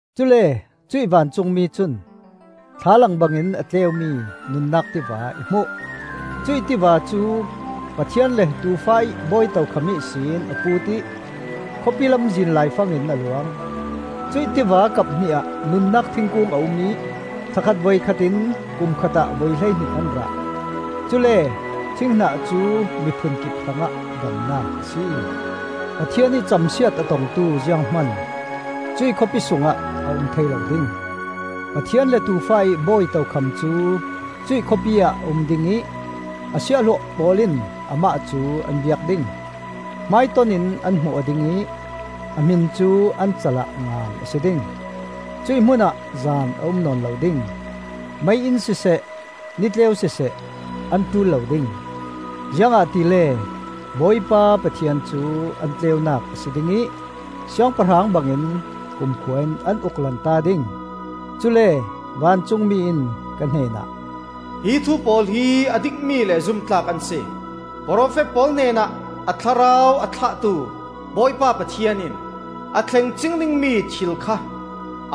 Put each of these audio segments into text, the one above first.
Cule cuih vancungmi cun thlalang bangin a tleumi nunnak tiva i hmuh. Cuih tiva cu Pathian le Tuufa ih bawi tokham ihsin a puut ih, khawpi lamzin laifang in a luang. Cuih tiva kap hnih ah nunnak thingkung a um ih thla khat voikhat in kum khatah voihleihnih an rah. Cule thinghnah cu mi phunkip hrangah damnak a si. Pathian ih camsiat a tongtu zianghman cuih khawpi sungah a um thei lo ding. Pathian le Tuufa ih bawi tokham cu cuih khawpi ah a um ding ih a siahhlawh pawl in amah cu an biak ding. Hmaiton in an hmu aw ding ih a hmin cu an cal ah ngan a si ding. Cuih hmunah zan a um nawn lo ding; mei-inn siseh nitleu siseh an ṭul lo ding, ziangahtile Bawipa Pathian cu an tleunak a si ding ih siangpahrang bangin kumkhua in an uk lanta ding. Cule vancungmi in ka hnenah, “Hi thu pawl hi a dikmi le zumtlak an si. Profet pawl hnenah a Thlarau a thlahtu Bawipa Pathian in a thleng cing dingmi thil kha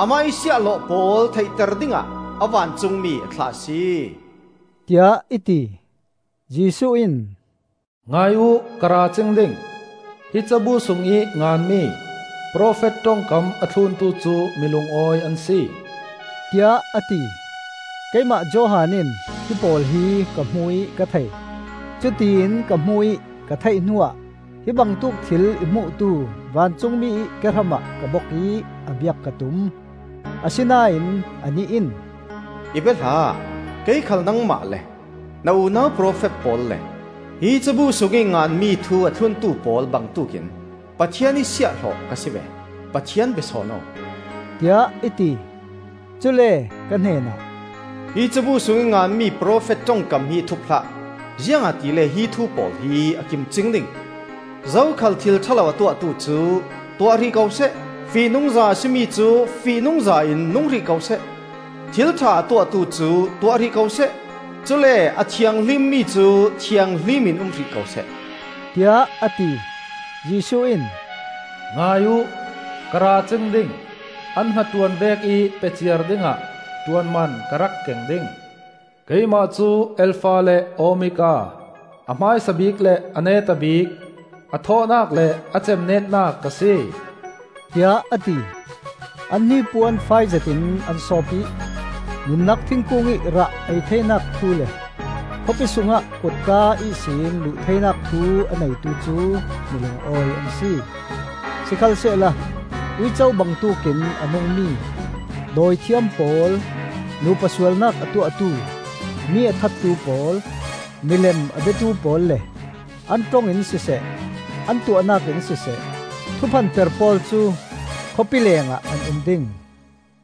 Amah ih siahhlawh pawl theihter dingah a vancungmi a thlah a si,” tiah i ti. Jesuh in, “Ngai uh, ka ra cing ding. Hi cabu sungih nganmi profet ṭongkam a thluntu cu mi lungawi an si,” tiah a ti. Keimah Johan in hipawl hi ka hmu ih ka thei. Cutiin ka hmu ih ka theih hnuah hi bangtuk thil i hmuhtu vancungmi ih kehramah ka bok ih a biak ka tum. Asinain anih in, “I bia hlah! Kei khal nangmah le na unau profet pawl le hi cabu sungih nganmi thu a thluntu pawl bangtuk in Pathian ih siahhlawh ka si ve! Pathian bia sawn aw!” tiah i ti. Cule ka hnenah, “Hi cabu sungih nganmi profet ṭongkam hi thup hlah, ziangahtile hi thu pawl hi a kim cing ding. Zokhal thil ṭha lo a tuahtu cu tuah hrih ko seh; fihnungza a si mi cu fihnungza in nung hrih ko seh; thil ṭha a tuahtu cu tuah hrih ko seh; cule a thianghlimmi cu thianghlim in um hrih ko seh,” tiah a ti. Jesuh in, “Ngai uh! Ka ra cing ding! An hnaṭuan vekih pe ciar dingah ṭuanman ka rak keng ding. Keimah cu Alfa le Omega, a hmaisa bik le a neta bik, a thawhnak le a cemnetnak ka si,” tiah a ti. An hnipuan fai zetin an sawp ih nunnak thingkungih rah ei theinak thu le khawpi sungah kotka ihsin luh theinak thu a neitu cu mi lungawi an si. Sikhalsehla uico bangtuk in a nungmi, dawithiam pawl, nupa sualnak a tuahtu, mi a thattu pawl, milem a biatu pawl le an ṭong in siseh, an tuahnak in siseh, thuphanper pawl cu khawpi lengah an um ding.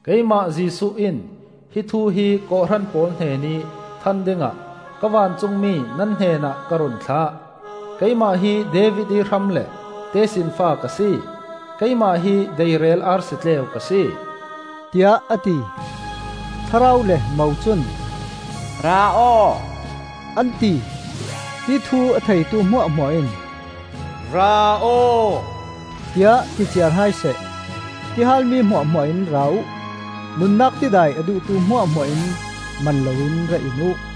“Keimah Jesuh in hi thu hi kawhhran pawl hnenih than dingah ka vancungmi nan hnenah ka run thlah. Keimah hi David ih hram le tesinfa ka si; keimah hi deirel arsi tleu ka si,” tiah a ti. Thlarau le Mo cun, “Ra aw,” an ti. Hi thu a theitu hmuahhmuah in, “Ra aw,” tiah ti ciar hai seh. Tihal mi hmuahhmuah in ra uh; nunnak tidai a duhtu hmuahhmuah in man loin ra in uh.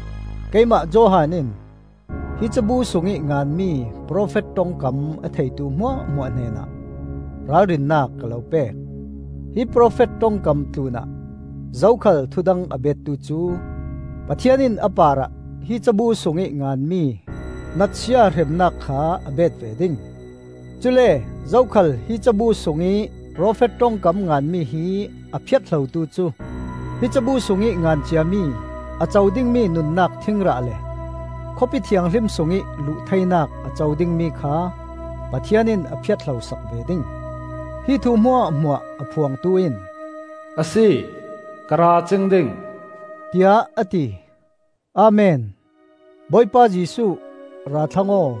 Keimah Johan in, hi cabu sungih nganmi profet ṭongkam a theitu hmuahhmuah hnenah, ralrinnak ka lo pek; hi profet ṭongkam tlunah zokhal thudang a bettu cu Pathian in a parah hi cabu sungih nganmi natsia hremnak kha a bet ve ding. Cule zokhal hi cabu sungih profet ṭongkam nganmi hi a phiat hlotu cu hi cabu sungih ngan ciami a co dingmi nunnak thingrah le Khawpi Thianghlim sungih luh theinak a co dingmi kha Pathian in a phiat hlosak ve ding. Hi thu hmuahhmuah a phuangtu in, “A si! Ka ra cing ding,” tiah a ti. Amen! Bawipa Jesuh, ra thlang aw!